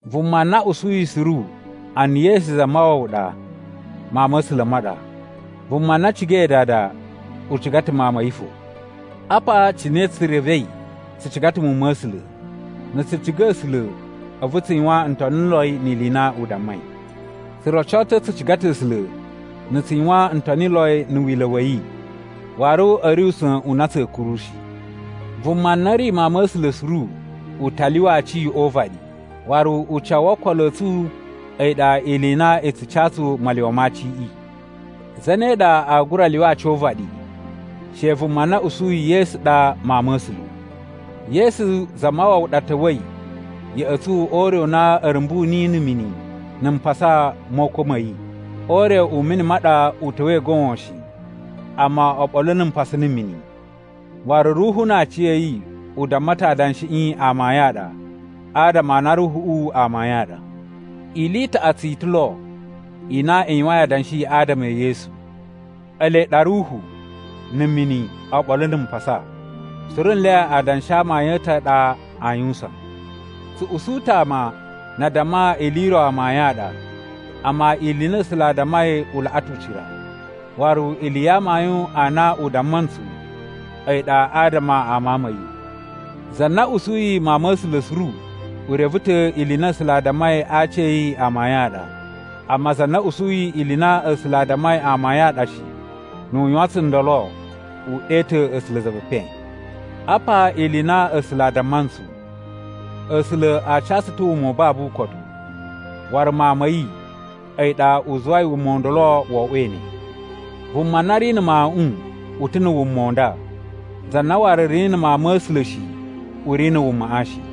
Vuma na usuyi suru a na Yesu Zamawawa ɗa, mawun ma̱ A̱sula̱ ma ɗa. Vuma na cigai dada u ciga ta̱ mawun ma̱ yi fo. Apa cine tsu revei tsu ciga ta̱ muwun ma̱ A̱sula̱: na̱ tsu ciga A̱sula̱ a̱vu tsu yuwan ntoniloi ni ili i na u dammai. Tsu roco ta̱ tsu ciga ta̱ A̱sula̱ na̱ tsu yuwan ntoniloi na̱ wila̱ wa̱ yi, waru a̱ ri usa̱n u na tsa̱a̱ kuru shi. Vuma na ri mawun ma̱ A̱sula̱ suru, u ta lyuwa aci o uvaɗi, waru ucawu wo okolo a̱ tsu a̱yi ɗa ili i na i tsu ca tsu malyuwa ma aciꞌi. Zane ɗa aa gura lyuwa aci o uvaɗi? She vuma na usuyi Yesu ɗa Mawun ma̱ A̱sula̱. Yesu Zamawawa ɗa ta̱wa̱i ya̱ꞌa̱ tsu o ure u na a̱ rumbu niyi na̱ mini na̱ mpasa mo ukwa̱ ma̱ yi. O ure u mini ma ɗa u ta̱wa̱i goon shi, amma oɓolo na̱ mpasa na̱ mini. Waru Ruhu na aciya̱yi u damma ta̱ adanshiꞌi amayun a ɗa, adama a na Ruhuꞌu a amayun a ɗa. Ili i taꞌatsu i ta̱ lo i na i yuwain adanshi adama e Yesu: Ele ɗa Ruhu, na̱ mini, oɓolo na̱ mpasa, suru nle adanshi a amayun a̱ ta̱ a ɗa aa yuwusan. Tsu usu ta̱ ama na a damma ili i ro amayun a ɗa. Amma ili i na A̱sula̱ a dammai u laꞌa ta̱ ucira, waru ili ya amayun a na u damma ntsu a̱yi ɗa adama a Mawun ma̱ yi. Za na usuyi Mawun ma̱ A̱sula̱ suru u reve ta̱ ili i na A̱sula̱ a dammai a aci a̱ yi amayun a ɗa. Amma za na usuyi ili i na A̱sula̱ a dammai amayun a ɗa shi, nu u yuwan tsundolo u ɗe ta̱ A̱sula̱ za ve epen. Apa ili i na A̱sula̱ a damma ntsu: A̱sula̱ a ca tsu ta̱ wuma u babu ukotu, waru Mawun ma̱ yi, a̱yi ɗa u zuwai wuma u ndolo wo oꞌwo ne. Vuma na ri na̱ Mawuꞌun u ta̱ na̱ wuma u nda, za na waru ri na̱ Mawun ma̱ A̱sula̱ shi u ri na̱ wumaꞌa shi.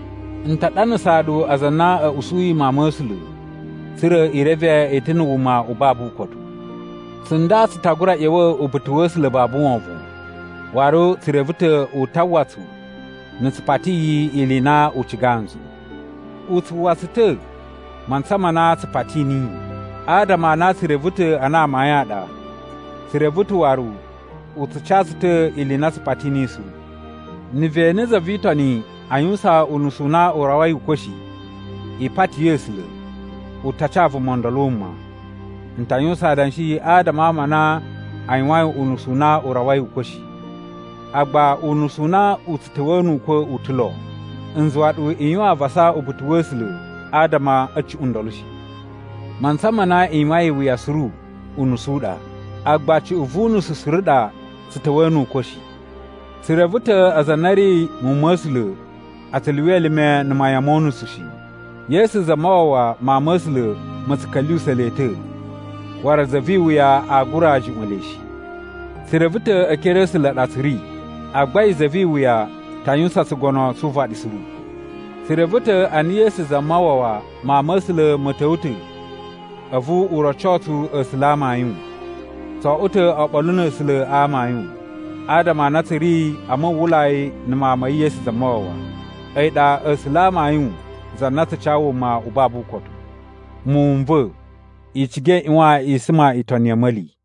N ta ɗanasaa ɗu aza a na a̱ usuyi Mawun ma̱ A̱sula̱, tsa̱ra̱ i reve i ta̱ na̱ wuma u babu ukotu. Tsunda tsu ta gura ꞌya̱wa̱ uba̱ta̱ wa̱ A̱sula̱ babu wovon, waru tsu reve ta̱ u ta uwwa tsu na̱ tsu pati yi ili i na u cigaa ntsu. U tsu uwwa tsu ta̱ mantsa ma na tsu pati niyi. Adama a na tsu reve ta̱ a na amayun a ɗa, tsu reve ta̱ waru u tsu ca tsu ta̱ ili i na tsu pati niyi suru. Na̱ ve ene za vi Itoni a yuwusan unusu u na u rawai ukwa̱ shi, i pati A̱sula̱, u ta ca vuma ndolo wuma. N ta yuwusan adanshi adama a ama a na a yuwain unusu u na u rawai ukwa̱ shi. Agba unusu u na u tsu ta̱wa̱a̱ nu ukwa̱ u ta̱ lo, n zuwa ɗu i yuwan avasa uba̱ta̱ wa̱ A̱sula̱ adama a̱ cuꞌun ndolo shi. Mantsa ma na i yuwain iwuya suru, unusu u ɗa, agba cuꞌun vu unusu suru ɗa tsu ta̱wa̱a̱ nu ukwa̱ shi. Tsu reve ta̱ aza a na a̱ ri muwun ma̱ A̱sula̱ a tsu lyuwa elime na̱ mayan mo unusu shi. Yesu Zamawawa Mawun ma̱ A̱sula̱ ma̱ tsu ka̱lyuwusa̱ le ta̱, waru za vi iwuya aa gura juꞌwa̱n le shi. Tsu reve ta̱ e ekere a̱ A̱sula̱ ɗa tsu ri, agba a̱yi za vi iwuya ta yuwusan tsugono tsu uvaɗi suru. Tsu reve ta̱ a na Yesu Zamawawa Mawun ma̱ A̱sula̱ ma̱ ta̱wa̱ ta̱ a̱vu u roco tsu A̱sula̱ a amayun. Tso oꞌwo ta̱ oɓolo na̱ A̱sula̱ a amayun, adama a na tsu ri a muwwulai na̱ Mawun ma̱ yi Yesu Zamawawa. A̱yi ɗa A̱sula̱ a amayun za na tsu ca wuma u babu ukotu. Muwun n va̱, i ciga i ꞌyuwan i suma itoni ya̱ a̱ma̱li.